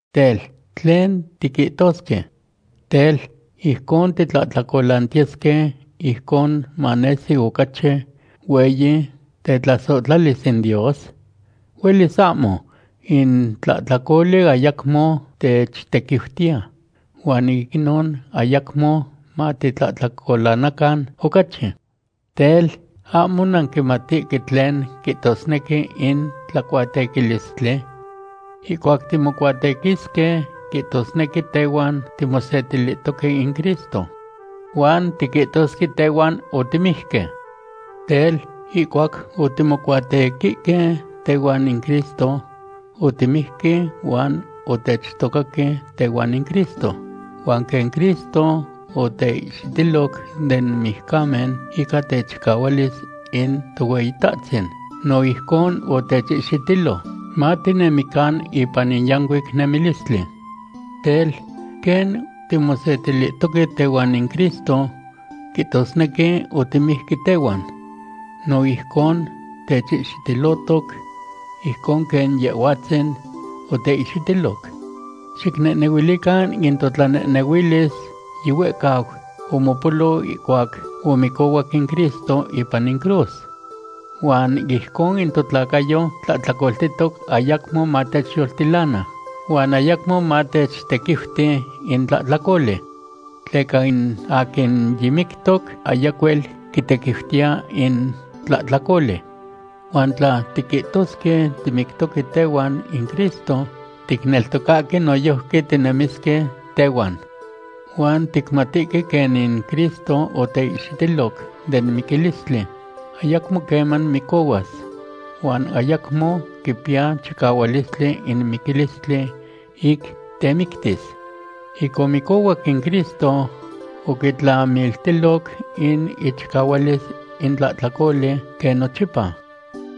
Tel, ¿tlen tiquihtosque? Tel, ¿ijcon titlahtlacolantiyesque ijcon manesi ocachi hueyi tetlasohtlalis in Dios? ¡Huelis ahmo! In tlahtlacoli ayacmo techtequiutiya, huan ic inon ayacmo matitlahtlacolanacan ocachi. Tel, ¿ahmo nanquimatihque tlen quihtosnequi in tlacuatequilistli? Ihcuac timocuatequisque, quihtosnequi tehuan timosetilihtoque in Cristo. Huan tiquihtosque tehuan otimijque. Tel, ihcuac otimocuatequihque tehuan in Cristo, otimijque huan otechtocaque tehuan in Cristo. Huan quen Cristo oteihxitiloc den mijcamen ica techicahualis in Tohueyitahtzin, no ijcon otechihxitilo, matinemican ipan in yancuic nemilistli. Tel, quen timosetilihtoque tehuan in Cristo, quihtosnequi otimijque tehuan, no ijcon techihxitilohtoc ijcon quen Yehhuatzin oteihxitiloc. Xicnehnehuilican in totlanehnehuilis yihuehcau omopolo ihcuac omicohuac in Cristo ipan in cruz. Huan ijcon in totlacayo tlahtlacoltihtoc ayacmo matechyoltilana, huan ayacmo matechtequiuti in tlahtlacoli. Tleca in aquin yimictoc, ayacuel quitequiutiya in tlahtlacoli. Huan tla tiquihtosque timictoque tehuan in Cristo, ticneltocahque noyojqui tinemisque tehuan. Huan ticmatihque quen in Cristo oteihxitiloc den miquilistli, ayacmo queman micohuas, huan ayacmo quipiya chicahualistli in miquilistli ic temictis. Ic omicohuac in Cristo, oquitlamiltiloc in ichicahualis in tlahtlacoli quen nochipa.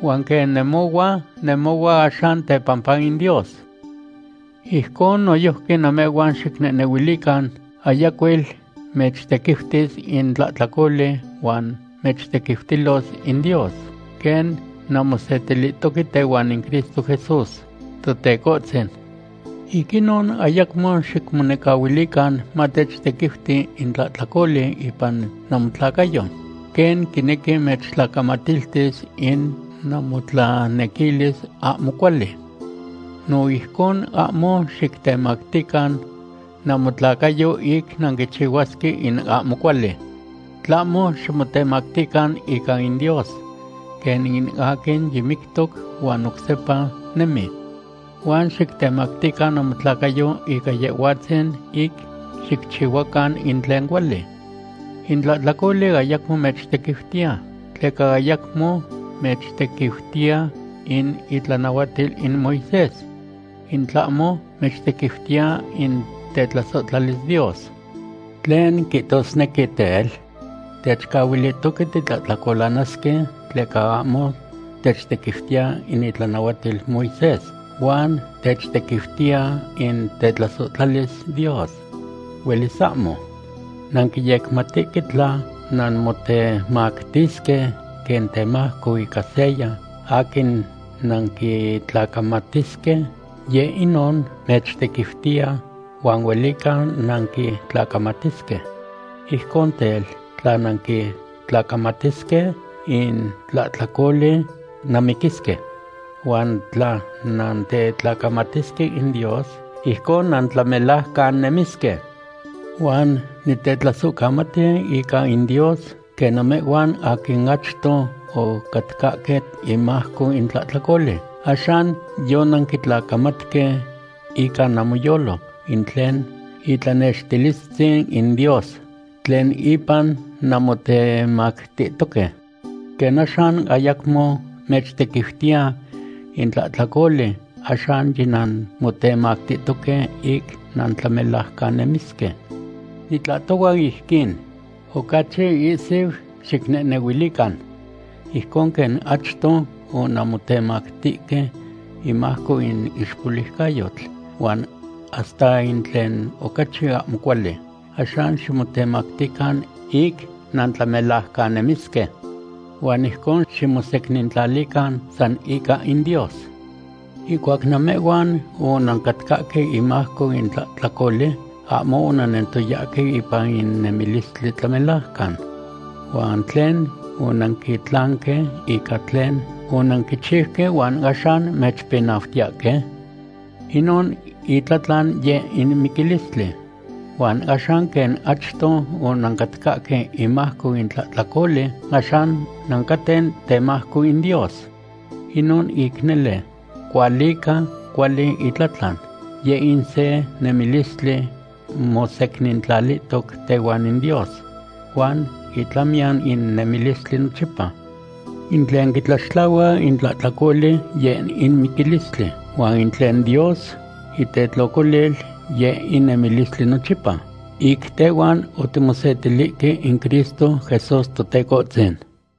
Huan quen nemohua, nemohua axan tepampa in Dios. Ijcon noyojqui namehhuan xicnehnehuilican ayacuel mechtequiutis in tlahtlacoli huan mechtequiutilos in Dios, quen nanmosetilihtoque tehuan in Cristo Jesús, Totecohtzin. Ic inon ayacmo xicmonecahuilican mamechtequiuti in tlahtlacoli ipan namotlacayo, quen quinequi mechtlacamatiltis in namotlanequilis ahmo cuali. No ijcon ahmo xictemactican namotlacayo ic nanquichihuasque in ahmo cuali, tlahmo ximotemactican ica in Dios, quen in aquin yimictoc huan oc sepa nemi. Huan xictemactican namotlacayo ica Yehhuatzin ic xicchihuacan in tlen cuali. In tlahtlacoli ayacmo mechtequiutiya, tleca ayacmo mechtequiutiya in itlanahuatil in Moisés. In tlahmo mechtequiutiya in tetlasohtlalis Dios. ¿Tlen quihtosnequi, tel? ¿Techcahuilihtoque titlahtlacolanasque tleca ahmo techtequiutiya in itlanahuatil Moisés, huan techtequiutiya in tetlasohtlalis Dios? ¡Huelis ahmo! Nanquiyecmatihque tla nanmotemactisque quen temajco ica seya aquin nanquitlacamatisque, yeh inon mechtequiutiya, huan huelica nanquitlacamatisque. Ijcon tel, tla nanquitlacamatisque in tlahtlacoli, nanmiquisque. Huan tla nantetlacamatisque in Dios, ijcon nantlamelajcannemisque. Huan nitetlasohcamati ica in Dios, quen namehhuan aquin achto ocatcahque imajco in tlahtlacoli, axan yonanquitlacamatque ica namoyolo in tlen itlanextililtzin in Dios tlen ipan nanmotemactihtoque. Quen axan ayacmo mechtequiutiya in tlahtlacoli, axan yinanmotemactihtoque ic nantlamelajcannemisque. Nitlahtohua ijquin, ocachi ihsiu xicnehnehuilican. Ijcon quen achto onanmotemactihque imajco in ixpoliucayotl, huan hasta in tlen ocachi ahmo cuali, axan ximotemactican ic nantlamelajcannemisque. Huan ijcon ximosecnintlalican san ica in Dios. Ihcuac namehhuan onancatcahque imajco in tlahtlacoli, ahmo onannentoyahque ipan in nemilistli tlamelajcan. ¿Huan tlen onanquitlanque ica tlen onanquichiuque huan axan mechpinautiyahque? Inon itlatlan yeh in miquilistli. Huan axan, quen achto onancatcahque imajco in tlahtlacoli, axan nancaten temajco in Dios. Inon ic nele cualica cuali itlatlan, yeh in se nemilistli mosecnintlalihtoc tehuan in Dios, huan itlamiyan in nemilistli nochipa. In tlen quitlaxtlahua in tlahtlacoli, yeh in miquilistli, huan in tlen Dios itetlocolil, yeh in nemilistli nochipa, ic tehuan otimosetilihque in Cristo Jesús Totecohtzin.